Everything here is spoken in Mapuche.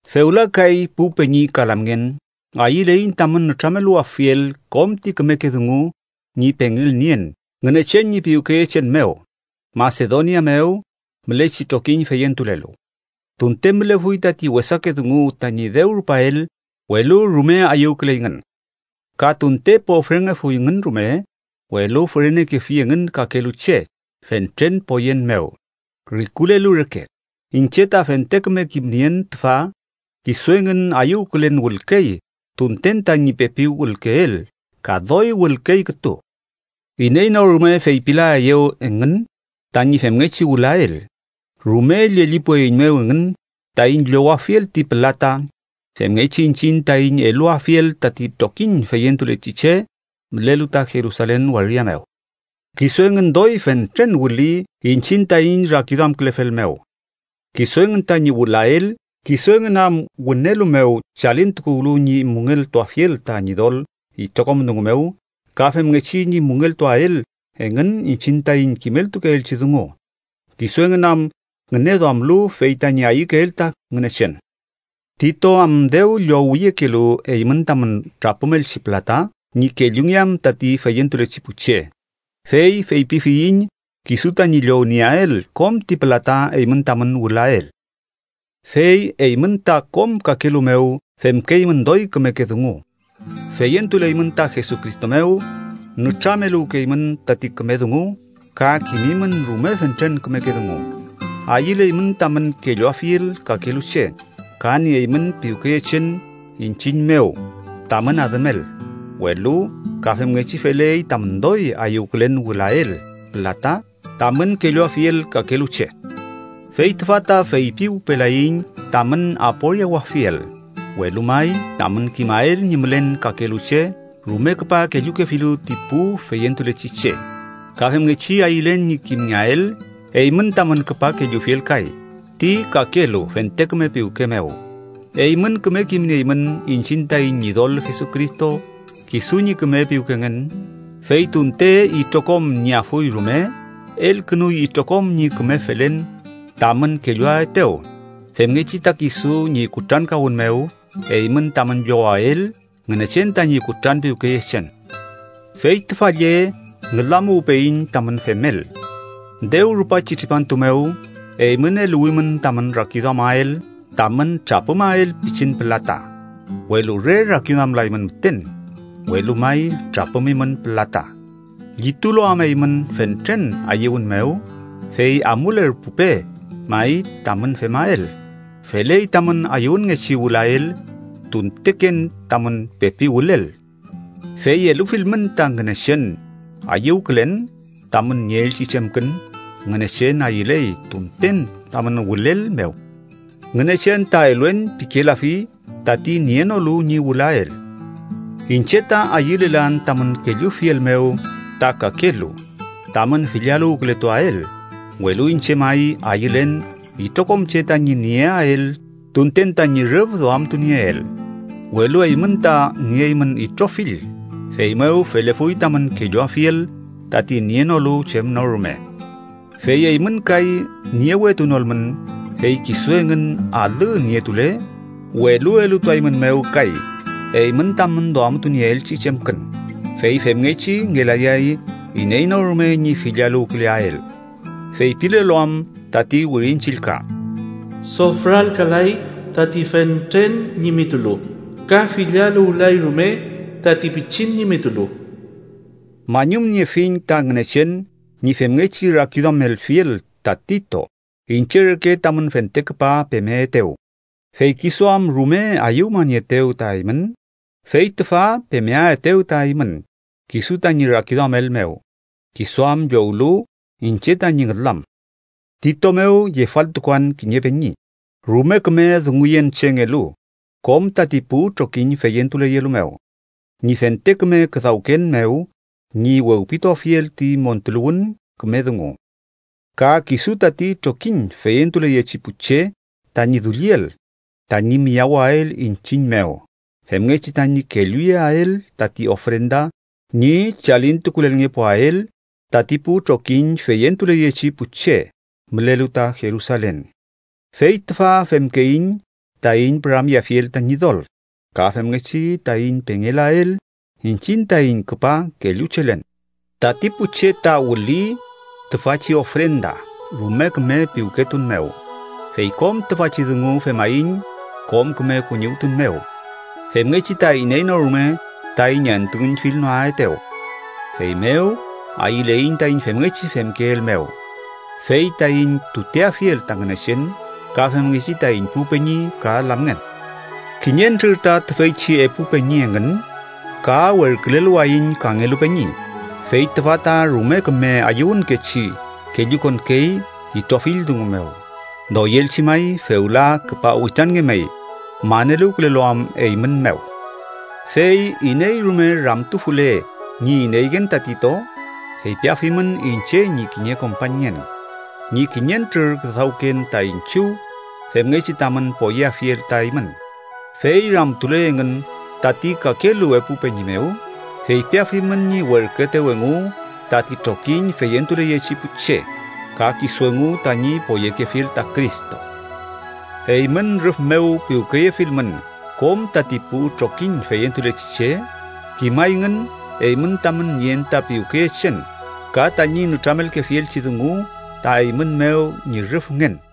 Fewla kay pu peñi ka lamngen, ayüleiñ tamün nütrameluwafiel kom ti kümeke dungu ñi pengelnien Ngünechen ñi piwkeyechen mew Masedonia mew mülechi trokiñ feyentulelu. Tunte mülefuy tati wesake dungu tañi dew rupael, welu rume ayüwküleyngün. Ka tunte pofrengefuyngün rume, welu fürenekefi engün kakelu che fentren poyen mew, rikulelu reke. Iñche ta fente küme kimnien tüfa: kisu engün ayüwkülen wülkey tunten tañi pepi wülkeel, ka doy wülkey kütu. Iney no rume feypilaeyew engün tañi femngechi wülael. Rume llellipueiñmew engün taiñ llowafiel ti pülata femngechi iñchiñ taiñ eluwafiel tati trokiñ feyentulechi che mülelu ta Jerusalen waria mew. Kisu engün doy fentren wüli iñchiñ taiñ rakiduamkülefel mew kisu engün tañi wülael, kisu engün am wünelu mew chalintukuwlu ñi müngeltuafiel ta Ñidol itrokom dungu mew, ka femngechi ñi müngeltuael engün iñchiñ taiñ kimeltukeelchi dungu, kisu engün am ngüneduamlu fey tañi ayükeel ta Ngünechen. Tito am dew llowiyekelu eymün tamün trapümelchi pülata ñi kellungeam tati feyentulechi pu che, fey feypifiyiñ kisu tañi llownieael kom ti pülata eymün tamün wülael. Fey eymün ta kom kakelu mew femkeymün doy kümeke dungu: feyentuleymün ta Jesucristo mew, nütrameluwkeymün tati küme dungu, ka kimimün rume fentren kümeke dungu, ayüleymün tamün kelluafiel kakelu che, ka nieymün piwkeyechen iñchiñ mew tamün adümel, welu ka femngechi feley tamün doy ayüwkülen wülael pülata tamün kelluafiel kakelu che. Fey tüfa ta feypiwpelayiñ tamün aporiawafiel, welu may tamün kimael ñi mülen kakelu che rume küpa kellukefilu ti pu feyentulechi che, ka femngechi ayülen ñi kimngeael eymün tamün küpa kellufiel kay ti kakelu fente küme piwke mew. Eymün küme kimnieymün iñchiñ taiñ Ñidol Jesucristo kisu ñi küme piwkengen, fey tunte itrokom nieafuy rume, elkünuy itrokom ñi küme felen tamün kelluaetew, femngechi ta kisu ñi kutrankawün mew eymün tamün llowael Ngünechen tañi kutranpiwkeyechen. Fey tüfa lle ngülamuwpeyiñ tamün femel: dew rupachi tripantu mew, eymün eluwimün tamün rakiduamael tamün trapümael pichin pülata, welu re rakiduamlaymün müten, welu may trapümimün pülata. Llitulu am eymün fentren ayüwün mew, fey amulerpupe may tamün femael. Feley tamün ayüwünngechi wülael tunteken tamün pepi wülel. Fey elufilmün ta Ngünechen ayüwkülen tamün nieelchi chemkün, Ngünechen ayüley tunten tamün wülel mew. Ngünechen ta “eluen” pikelafi tati nienolu ñi wülael. Iñche ta ayülelan tamün kellufiel mew ta kakelu, tamün fillaluwkületuael, welu iñche may ayülen itrokom che tañi nieael tunten tañi rüf duamtunieel. Welu eymün ta nieymün itrofill, feymew felefuy tamün kelluafiel tati nienolu chem no rume. Fey eymün kay niewetunolmün, fey kisu engün alü nietule, welu elutuaeymünmew kay eymün tamün duamtunieelchi chemkün, fey femngechi ngelayay iney no rume ñi fillaluwküleael. Feypilelu am tati Wirin Chillka: “Sofralkalay tati fentren ñimitulu, ka fillaluwlay rume tati pichin ñimitulu.” Mañumniefiñ ta Ngünechen ñi femngechi rakiduamelfiel ta Tito iñche reke tamün fente küpa pemeetew. Fey kisu am rume ayüwmanieetew ta eymün fey tüfa pemeaetew ta eymün kisu tañi rakiduamel mew, kisu am llowlu iñche tañi ngülam. Tito mew yefaltukuan kiñe peñi, rume küme dunguyenchengelu kom tati pu trokiñ feyentuleyelu mew, ñi fente küme küdawken mew ñi wewpituafiel ti montuluwün küme dungu. Ka kisu tati trokiñ feyentuleyechi pu che tañi dulliel tañi miyawael iñchiñ mew femngechi tañi kelluyeael tati ofrenda ñi chalintukulelngepuael tati pu trokiñ feyentuleyechi pu che mülelu ta Jerusalen. Fey tüfa femkeiñ taiñ püramyeafiel ta Ñidol, ka femngechi taiñ pengelael iñchiñ taiñ küpa kelluchelen. Tati pu che ta wüli tüfachi ofrenda rume küme piwketun mew, fey kom tüfachi dungu femaiñ kom küme kuñiwtun mew, femngechi ta iney no rume taiñ entuüñfilnoaetew. Feymew ayüleiñ taiñ femngechi femkeel mew, fey taiñ tuteafiel ta Ngünechen ka femngechi taiñ pu peñi ka lamngen. Kiñentrür ta tüfeychi epu peñi engün, ka werküleluwayiñ kangelu peñi, fey tüfa ta rume küme ayüwünkechi kellukonkey itrofill dungu mew. Doyelchi may fewla küpa witranngemey, maneluwkülelu am eymün mew. Fey iney rume ramtufule ñi ineyngen ta Tito, feypiafimün iñche ñi kiñe kompañngen ñi kiñentrür küdawken ta iñchiw, femngechi tamün poyeafiel ta eymün. Fey ramtule engün tati kakelu epu peñi mew, feypiafimün ñi werküetew engu tati trokiñ feyentuleyechi pu che, ka kisu engu tañi poyekefiel ta Cristo. Eymün rüf mew piwkeyefilmün kom tati pu trokiñ feyentulechi che, kimayngün eymün tamün nien ta piwkeyechen ka tañi nütramelkefielchi dungu ta eymün mew ñi rüfngen.